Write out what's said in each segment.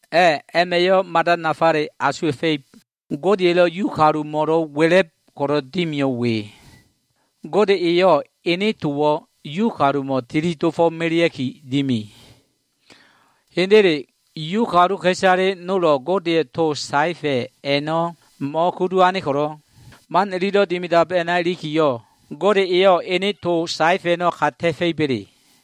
A꞉, a꞉ma꞉yo꞉ mada nafale asuwa꞉fa꞉ib. Godeya꞉lo꞉ Yu kalumo꞉lo꞉ wa꞉la꞉b ko꞉lo꞉ dimiyo꞉ we. Gode eyo꞉ ene towo꞉ Yu kalumo꞉ tili dofo꞉melea꞉ki dimi. Hendele, Yu kaluka꞉isale nolo꞉ Godeya꞉ to saefa꞉ a꞉no꞉ mo꞉kudu ane ko꞉lo꞉, man ililo꞉ dimidab a꞉na ilikiyo꞉, Gode eyo꞉ ene to saefa꞉ a꞉no꞉ ka ta꞉fa꞉iba꞉le?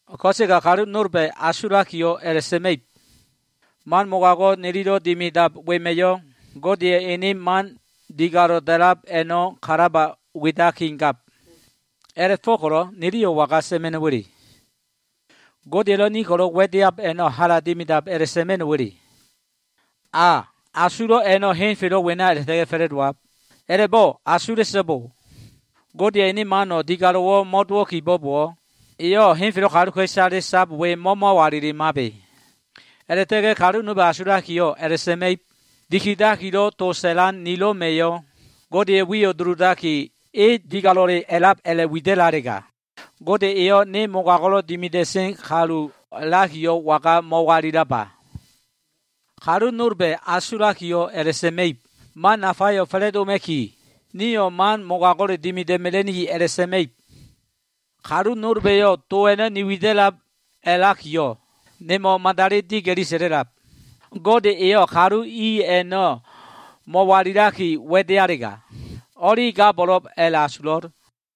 Ko꞉sega kalu nolba꞉ asulakiyo꞉ a꞉la꞉sa꞉ma꞉ib, “Man mogago꞉ nililo꞉ dimidab wema꞉yo꞉ Godeya꞉ ene man digalo꞉ da꞉lab a꞉no꞉ kalaba widakigab.” A꞉la꞉fo꞉ko꞉lo꞉ niliyo꞉ waga sa꞉ma꞉no꞉wa꞉le? “Gode elo꞉ ni ko꞉lo꞉ wa꞉deab a꞉no꞉, hala dimidab” a꞉la꞉sa꞉ma꞉no꞉wa꞉le? A, asulo꞉ a꞉no꞉ henfelo꞉ wena a꞉la꞉ta꞉ga꞉ fa꞉la꞉dowab. A꞉la꞉bo꞉ asula꞉so꞉bo! Godeya꞉ ene mano꞉ digalo꞉wo꞉ mo꞉dowo꞉ kibo꞉bowo꞉, eyo꞉ henfelo꞉ kaluka꞉isale sab we mo꞉mo꞉walilimabe. A꞉la꞉ta꞉ga꞉ kalu nolba꞉ asulakiyo꞉ a꞉la꞉sa꞉ma꞉ib, “Dikidakilo꞉ to sa꞉lan nilo꞉ma꞉yo꞉ Godeya꞉ wiyo꞉ duludaki, e digalo꞉le a꞉lab a꞉la꞉widalega, Gode eyo꞉ ne mogago꞉lo꞉ dimida꞉sen kalu a꞉lakiyo꞉ waga mo꞉walilaba?” Kalu nolba꞉ asulakiyo꞉ a꞉la꞉sa꞉ma꞉ib, “Man nafayo꞉ fa꞉la꞉doma꞉ki, nio꞉ man mogago꞉le dimida꞉ mela꞉niki” a꞉la꞉sa꞉ma꞉ib. Kalu nolba꞉yo꞉ to a꞉no꞉ ni wida꞉lab a꞉lakiyo꞉ nemo꞉wo꞉ madali diga꞉li sa꞉la꞉lab. Gode eyo꞉ kalu i a꞉no꞉ mo꞉walila꞉sa꞉ga꞉ wa꞉dealega o꞉li gabo꞉lo꞉b a꞉la꞉asulo꞉l.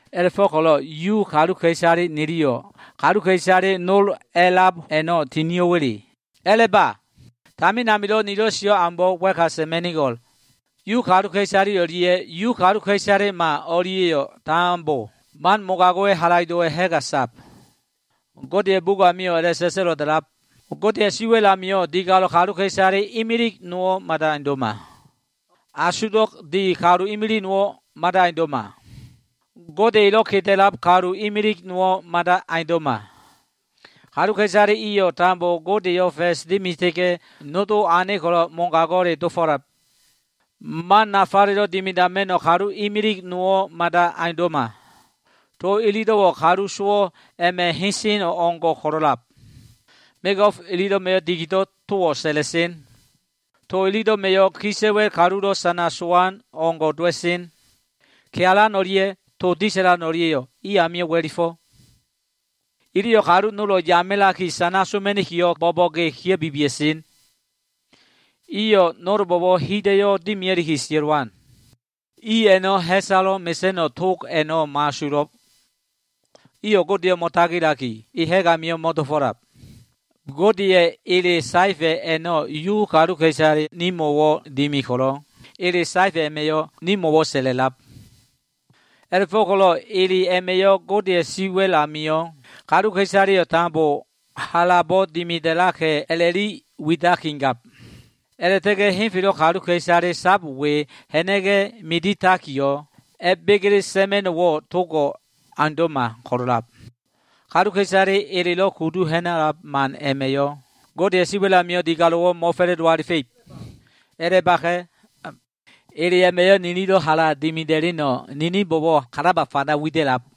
A꞉la꞉fo꞉ko꞉lo꞉ Yu kalu niliyo꞉ kaluka꞉isale nol a꞉lab a꞉no꞉ tinio꞉wa꞉le? A꞉la꞉ba! Tamin amilo꞉ nilo꞉ sio꞉ aumbo꞉ wa꞉ka sa꞉ma꞉nigo꞉l. Yu kaluka꞉isale o꞉lia꞉ Yu kaluka꞉isalema o꞉lia꞉yo꞉ tambo, man mogago꞉wa꞉ halaido꞉ a꞉ma꞉ ha꞉ga sab. Godeya꞉ bugo꞉ amio꞉ a꞉la꞉sa꞉sa꞉lo꞉ da꞉lab, “Godeya꞉ siwa꞉l amio꞉ digalo꞉le kaluka꞉isale imilig nowo꞉ mada aundo꞉ma. Asugdo꞉ di kalu imilig nowo꞉ mada aundo꞉ma. Gode elo꞉ keda꞉lab kalu imilig nowo꞉ mada aundo꞉ma. Kaluka꞉isale iyo꞉ tambo Godeyo꞉ fa꞉s dimita꞉ga꞉, nodo ane ko꞉lo꞉ mogago꞉le dofo꞉lab. Man nafalo꞉ dimidama꞉no꞉ kalu imilig nowo꞉ mada aundo꞉ma.” “To ililo꞉wo꞉ kalu sowo꞉ a꞉ma꞉ hesen o꞉ngo꞉ ko꞉lo꞉lab. Mego꞉f ililo꞉ma꞉yo꞉ dikido꞉ towo꞉ sa꞉la꞉sen. To ililo꞉ma꞉yo꞉ kisa꞉wa꞉l kalulo꞉ sana sowan o꞉ngo꞉ dowa꞉sen. Kealan o꞉lia꞉ to disa꞉lan o꞉lia꞉yo꞉ i amio꞉ wa꞉lifo꞉. Iliyo꞉ kalu nolo꞉ yamilaki sana soma꞉nikiyo꞉, bo꞉bo꞉ge kia꞉bibia꞉sen. Iyo꞉ nolbo꞉wo꞉ hida꞉yo꞉ dimia꞉liki sia꞉lowan. I a꞉no꞉ ha꞉salo꞉ mesa꞉no꞉ tog a꞉no꞉ mo꞉asulo꞉. Iyo꞉ Godeyo꞉ mo꞉tagilaki, e ha꞉g amio꞉ mo꞉dofo꞉lab.” Godeya꞉ ele saefa꞉ a꞉no꞉ Yu kaluka꞉isale nimo꞉wo꞉ dimi ko꞉lo꞉, ele saefa꞉ a꞉ma꞉yo꞉ nimo꞉wo꞉ sa꞉la꞉lab. A꞉la꞉fo꞉ko꞉lo꞉ ele a꞉ma꞉yo꞉ Godeya꞉ siwa꞉l amio꞉ kaluka꞉isaleyo꞉ tambo halabo꞉ dimida꞉laka꞉ a꞉la꞉li widakigab. A꞉la꞉ta꞉ga꞉ henfelo꞉ kaluka꞉isale sab we ha꞉na꞉ga꞉ miditakiyo꞉, a꞉begele sa꞉ma꞉no꞉wo꞉ togo꞉ aundo꞉ma ko꞉lo꞉lab. Kaluka꞉isale elelo꞉ kudu ha꞉na꞉lab man a꞉ma꞉yo꞉ Godeya꞉ siwa꞉l amio꞉ digalo꞉wo꞉ mo꞉fa꞉la꞉do alifa꞉ib. A꞉la꞉baka꞉. Ele a꞉ma꞉yo꞉ nililo꞉ hala dimida꞉leno꞉ nininbo꞉wo꞉ kalaba fanda wida꞉lab.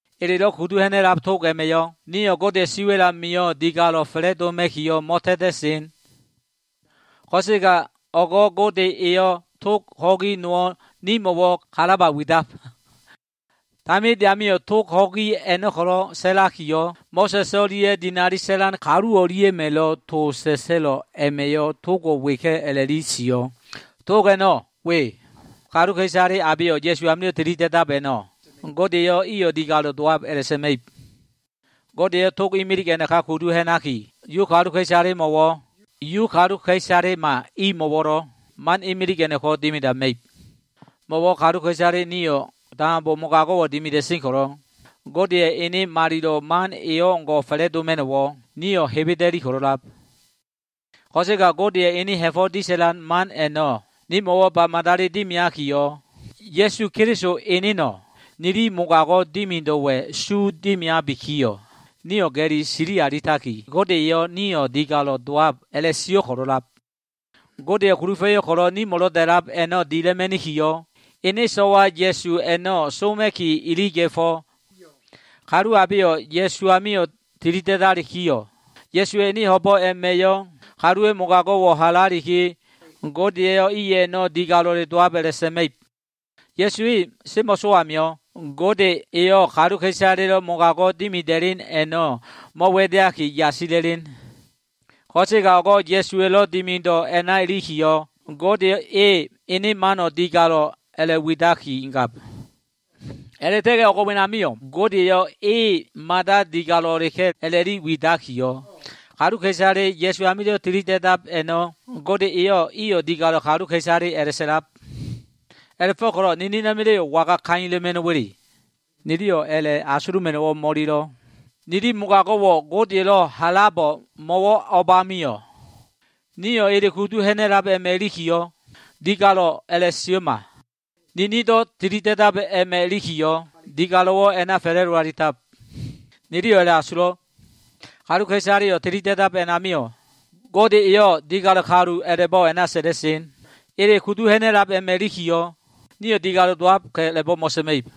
Elelo꞉ kudu ha꞉na꞉lab tog a꞉ma꞉yo꞉ nio꞉ Godeya꞉ siwa꞉l amio꞉ digalo꞉ fa꞉la꞉doma꞉kiyo꞉ mo꞉ta꞉ta꞉sen. Ko꞉sega o꞉go꞉ Gode eyo꞉ tog ho꞉gi nowo꞉ nimo꞉wo꞉ kalaba widab. Taminde amio꞉, tog ho꞉gi a꞉no꞉ ko꞉lo꞉ sa꞉lakiyo꞉, Mo꞉sa꞉s o꞉lia꞉ dinali sa꞉lan kalu o꞉lia꞉ma꞉lo꞉ to sa꞉sa꞉lo꞉ a꞉ma꞉yo꞉ togo꞉ weka꞉ a꞉la꞉li sio꞉. Tog a꞉no꞉ we. Kaluka꞉isale abeyo꞉ Ya꞉su amilo꞉ tilida꞉dab a꞉no꞉, Gode eyo꞉ iyo꞉ digalo꞉ dowab a꞉la꞉sa꞉ma꞉ib. Gode eyo꞉ tog imilig a꞉naka kudu ha꞉naki, Yu kaluka꞉isalemo꞉wo꞉, Yu kaluka꞉isalema imo꞉wo꞉lo꞉ man imilig a꞉no꞉ko꞉ dimidama꞉ib. Mo꞉wo꞉ kaluka꞉isale nio꞉ tambo mogago꞉wo꞉ dimida꞉sen ko꞉lo꞉, Godeya꞉ ene malilo꞉ mano꞉ e o꞉ngo꞉ fa꞉la꞉doma꞉no꞉wo꞉ nio꞉ hebeda꞉li ko꞉lo꞉lab. Ko꞉sega Godeya꞉ enen ha꞉fo꞉ disa꞉lan man a꞉no꞉ nimo꞉wo꞉ ba madali dimiakiyo꞉, Ya꞉su Keliso eneno꞉ nili mogago꞉ dimido꞉wa꞉ su dimiabikiyo꞉, nio꞉ ga꞉li sili alitaki, Gode eyo꞉ nio꞉ digalo꞉ dowab a꞉la꞉sio꞉ ko꞉lo꞉lab. Godeya꞉ kulufa꞉yo꞉ nimo꞉lo꞉ da꞉lab a꞉no꞉ dila꞉ma꞉nikiyo꞉, ene so꞉wa Ya꞉su a꞉no꞉ soma꞉ki iliga꞉fo꞉. Kalu abeyo꞉ Ya꞉su amio꞉ tili da꞉dalikiyo꞉, Ya꞉suwa꞉ ene ho꞉bo꞉ a꞉ma꞉yo꞉ kaluwa꞉ mogago꞉wo꞉ halaliki, Gode eyo꞉ i a꞉no꞉ digalo꞉le dowab a꞉la꞉sa꞉ma꞉ib. Ya꞉su e semo꞉sowo꞉ amio꞉, Gode eyo꞉ kaluka꞉isaleya꞉lo꞉ mogago꞉ dimida꞉len a꞉no꞉ mo꞉wa꞉deaki yasila꞉len. Ko꞉sega o꞉go꞉ Ya꞉suwa꞉lo꞉ dimido꞉ a꞉na ilikiyo꞉, Gode eyo꞉ ene mano꞉ digalo꞉ a꞉la꞉widakigab. A꞉la꞉ta꞉ga꞉ o꞉g wenamio꞉, Gode eyo꞉ e mada digalo꞉leka꞉ a꞉la꞉li widakiyo꞉, kaluka꞉isale Ya꞉su amilo꞉ tilida꞉dab a꞉no꞉ Gode eyo꞉ iyo꞉ digalo꞉ kaluka꞉isale a꞉la꞉sa꞉lab. A꞉la꞉fo꞉ko꞉lo꞉ ninina꞉ma꞉la꞉yo꞉ waga kaila꞉ma꞉no꞉wo꞉? Niliyo꞉ a꞉la꞉ asuluma꞉no꞉wo꞉ mo꞉ililo꞉. Nili mogago꞉wo꞉ Godeya꞉lo꞉ halabo꞉ mo꞉wo꞉ o꞉bamio꞉? Nio꞉ ele kudu ha꞉na꞉lab a꞉ma꞉ ilikiyo꞉, digalo꞉ a꞉la꞉sio꞉ma. Ninindo꞉ tilida꞉dab a꞉ma꞉ ilikiyo꞉, digalo꞉wo꞉ a꞉na fa꞉la꞉do alitab. Niliyo꞉ a꞉la꞉asulo꞉. Kaluka꞉isaleyo꞉ tilida꞉dab a꞉namio꞉, Gode eyo꞉ digalo꞉ kalu a꞉la꞉bo꞉ a꞉na sa꞉la꞉sen. Ele kudu ha꞉na꞉lab a꞉ma꞉ ilikiyo꞉, nio꞉ digalo꞉ dowab a꞉la꞉bo꞉ mo꞉sa꞉ma꞉ib.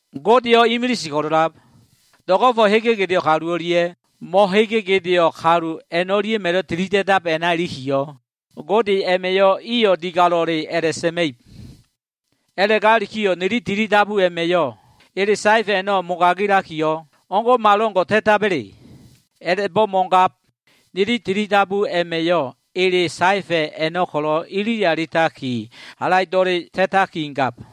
Godeyo꞉ imilise ko꞉lo꞉lab. Do꞉go꞉fo꞉ hege gedeo꞉ kalu o꞉lia꞉ mo꞉hege gedeo꞉ kalu a꞉no꞉lia꞉ma꞉lo꞉ tilida꞉dab a꞉na ilikiyo꞉, Gode a꞉ma꞉yo꞉ iyo꞉ digalo꞉le a꞉la꞉sa꞉ma꞉ib. A꞉la꞉gakiyo꞉, nili tilidabu a꞉ma꞉yo꞉ ele saefa꞉ a꞉no꞉ mogagilakiyo꞉, o꞉ngo꞉malo꞉ngo꞉ ta꞉taba꞉le? A꞉la꞉bo꞉ mo꞉gab. Nili tilidabu a꞉ma꞉yo꞉, ele saefa꞉ a꞉no꞉ ko꞉lo꞉ ilili alitaki halaido꞉le ta꞉takigab.